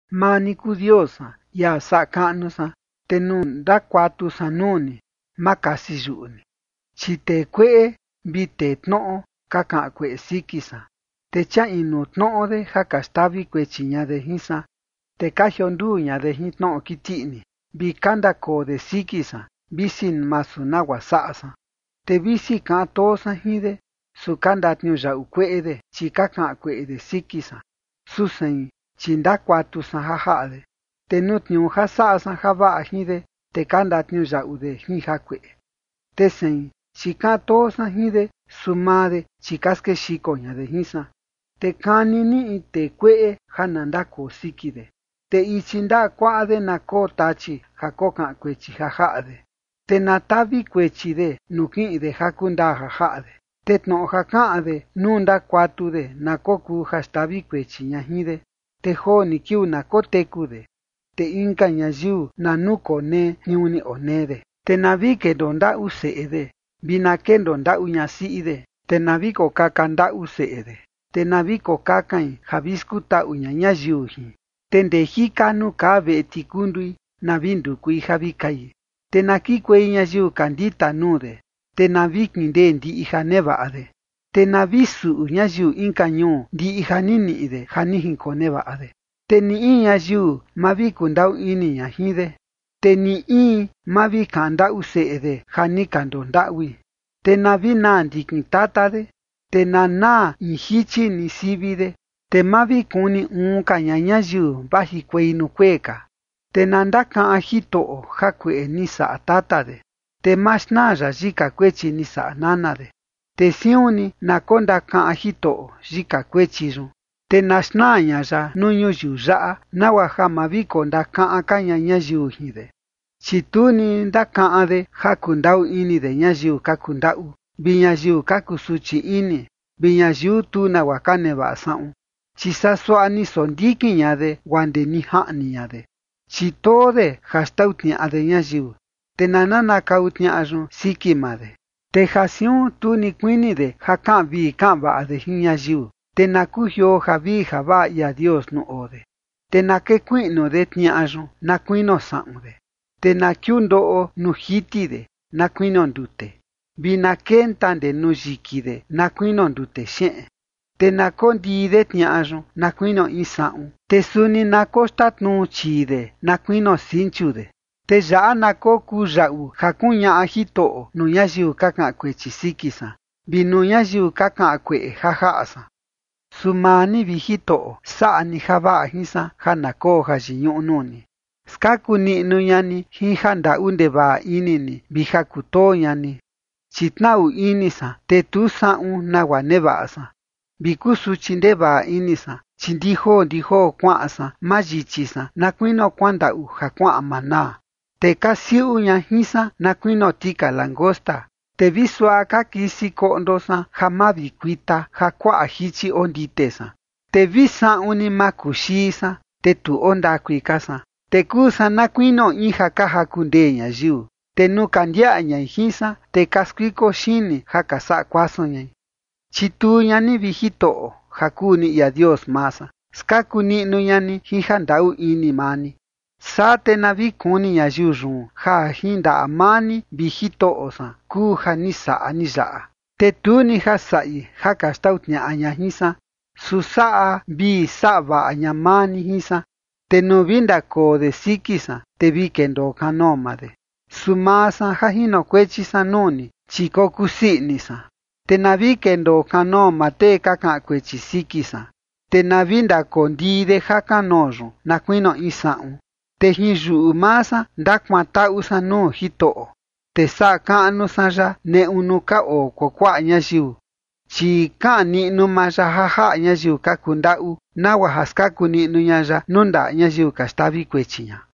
Maa ni kuu Dios san, ia saꞌa kaꞌnu san. Te nuu ndakuatu san nuu ni, ma kasi yuꞌu ni, chi tee kueꞌe vi tee tnoꞌo ka kaꞌan kueꞌe siki san, te chia inu tnoꞌo de ja ka xtavi kuechi ña de jin san. Te ka jionduu ña de jin tnoꞌo kiti ini, vi ka ndakoo de siki san, visi masu nagua saꞌa san. Te visi kaꞌan too san jin de, su ka ndatniuyaꞌu kueꞌe de, chi ka kaꞌan kueꞌe de siki san, su sein, chi ndakuatu san ja jaꞌa de. Te nuu tniuu ja saꞌa san javaꞌa jin de, te ka ndatniuyaꞌu de jin jakueꞌe, te sein, chi kaꞌan too san jin de; su maa de, chi ka skexiko ña de jin san. Te kani ni in tee kueꞌe ja na ndakoo siki de, te ichi ndaꞌa kuaꞌa de, na koo Tachi ja kokaꞌan kuechi ja jaꞌa de. Te na tavi kuechi de nuu kiꞌin de ja kundaa ja jaꞌa de, te tnoꞌo ja kaꞌan de nuu ndakuatu de na kokuu ja xtavi kuechi ña jin de. Te joo ni kiuu na koteku de, te inka ñayiu na nukonee tniuu ni onee de. Te na vi kendoo ndaꞌu seꞌe de, vi na kendoo ndaꞌu ñasiꞌi de. Te na vi kokaka ndaꞌu seꞌe de, te na vi kokakain ja vi skutaꞌu ña ñayiu jin, te ndee jika nuu kaa veꞌe tikundui, na vi ndukui ja vi kai. Te na kikuei ñayiu ka ndita nuu de, te na vi kindei ndiꞌi ja nevaꞌa de, te na vi suꞌu ñayiu inka ñuu ndiꞌi ja ni niꞌi de ja ni jinkonevaꞌa de. Te ni in ñayiu ma vi kundaꞌu ini ña jin de, te ni in, ma vi kaꞌan ndaꞌu seꞌe de ja ni ka ndondaꞌui. Te na vi naa ndikin tata de, te na naa in jichi ni sivi de, te ma vi kuni uun ka ña ñayiu vajikuei nuu kuee ka. Te na ndakaꞌan Jitoꞌo jakueꞌe ni saꞌa tata de, te ma xnaa ya yika kuechi ni saꞌa nana de. Te siun ni na kondakaꞌan Jitoꞌo yika kuechi yun, te na xnaa ña ya nuu ñuyiu yaꞌa, nagua ja ma vi kondakaꞌan ka ña ñayiu jin de. Chi tu ni ndakaꞌan de ja kundaꞌu ini de ñayiu ka kundaꞌu, vi ñayiu ka kusuchi ini vi ñayiu tu nagua ka nevaꞌa saꞌun, chi saa suaꞌa ni sondikin ña de guaa ndee ni jaꞌni ña de. Chi too de ja xtau tniaꞌa de ñayiu, te na nanakau tniaꞌa yun siki maa de. Te ja siun tu ni kuini de ja kaꞌan vii kaꞌan vaꞌa de jin ñayiu, te na kujioo javii javaꞌa ia Dios nuu oo de. Te na kekuiꞌnu de tniaꞌa yun na kuinio saꞌun de, te na kiundoꞌo nuu jiti de na kuinio ndute, vi na kenta ndee nuu yiki de na kuinio ndute xeꞌen. Te na kondii de tniaꞌa yun na kuinio in saꞌun, te suni na koxtatnuu chii de na kuinio sinchu de. Te yaꞌa na kokuu yaꞌu ja kuñaꞌa Jitoꞌo nuu ñayiu ka kaꞌan kuechi siki san, vi nuu ñayiu ka kaꞌan kueꞌe ja jaꞌa san. Su maa ni, vi Jitoꞌo, saꞌa ni javaꞌa jin san ja na koo jayiñuꞌu nuu ni. Skaku niꞌnu ña ni jin ja ndaꞌu ndevaꞌa ini ni vi ja kutoo ña ni. Chi tnaꞌu ini san, te tu saꞌun nagua nevaꞌa san, vi kusuchi ndevaꞌa ini san. Chi ndi joo ndi joo kuaꞌan san mayichi san, na kuinio kuandaꞌu ja kuaꞌan manaa, te ka siuꞌu ña jin san na kuinio tika langosta. Te vi suaꞌa ka kisi koꞌndo san ja mavikuita ja kuaꞌa jichi ondite san, te vi saꞌun ni makuxii san, te tu oo ndakui ka san. Te kuu san na ni kuinio in ja ka jaku ndee ñayiu, te nuu ka ndiaꞌa ñai jin san, te ka skuiko xini ja ka saꞌa kuasun ñai. Chituu ña ni, vi Jitoꞌo, ja kuu ni ia Dios maa san. Skaku niꞌnu ña ni jin ja ndaꞌu ini maa ni. Saa te na vi kuni ñayiu yun, ja jin ndaꞌa maa ni, vi Jitoꞌo san, kuu ja ni saꞌa ni yaꞌa. Te tu ni ja saꞌi ja ka xtau tniaꞌa ña jin san, su saꞌa vii saꞌa vaꞌa ña maa ni jin san, te nuu vi ndakoo de siki san, te vi kendoo kanoo maa de, su maa san ja jinokuechi san nuu ni, chi kokusii ini san. Te na vi kendoo kanoo maa tee ka kaꞌan kuechi siki san, te na vi kakondii de ja kanoo yun na kuinio in saꞌun. Te jin yuꞌu maa san ndakuantaꞌu san nuu Jitoꞌo, te saꞌa kaꞌnu san ya neꞌu nuu ka oo kuakuaꞌa ñayiu. Chi kaꞌan niꞌnu maa ya ja jaꞌa ñayiu ka kundaꞌu, nagua ja skaku niꞌnu ña ya nuu ndaꞌa ñayiu ka xtavi kuechi ña.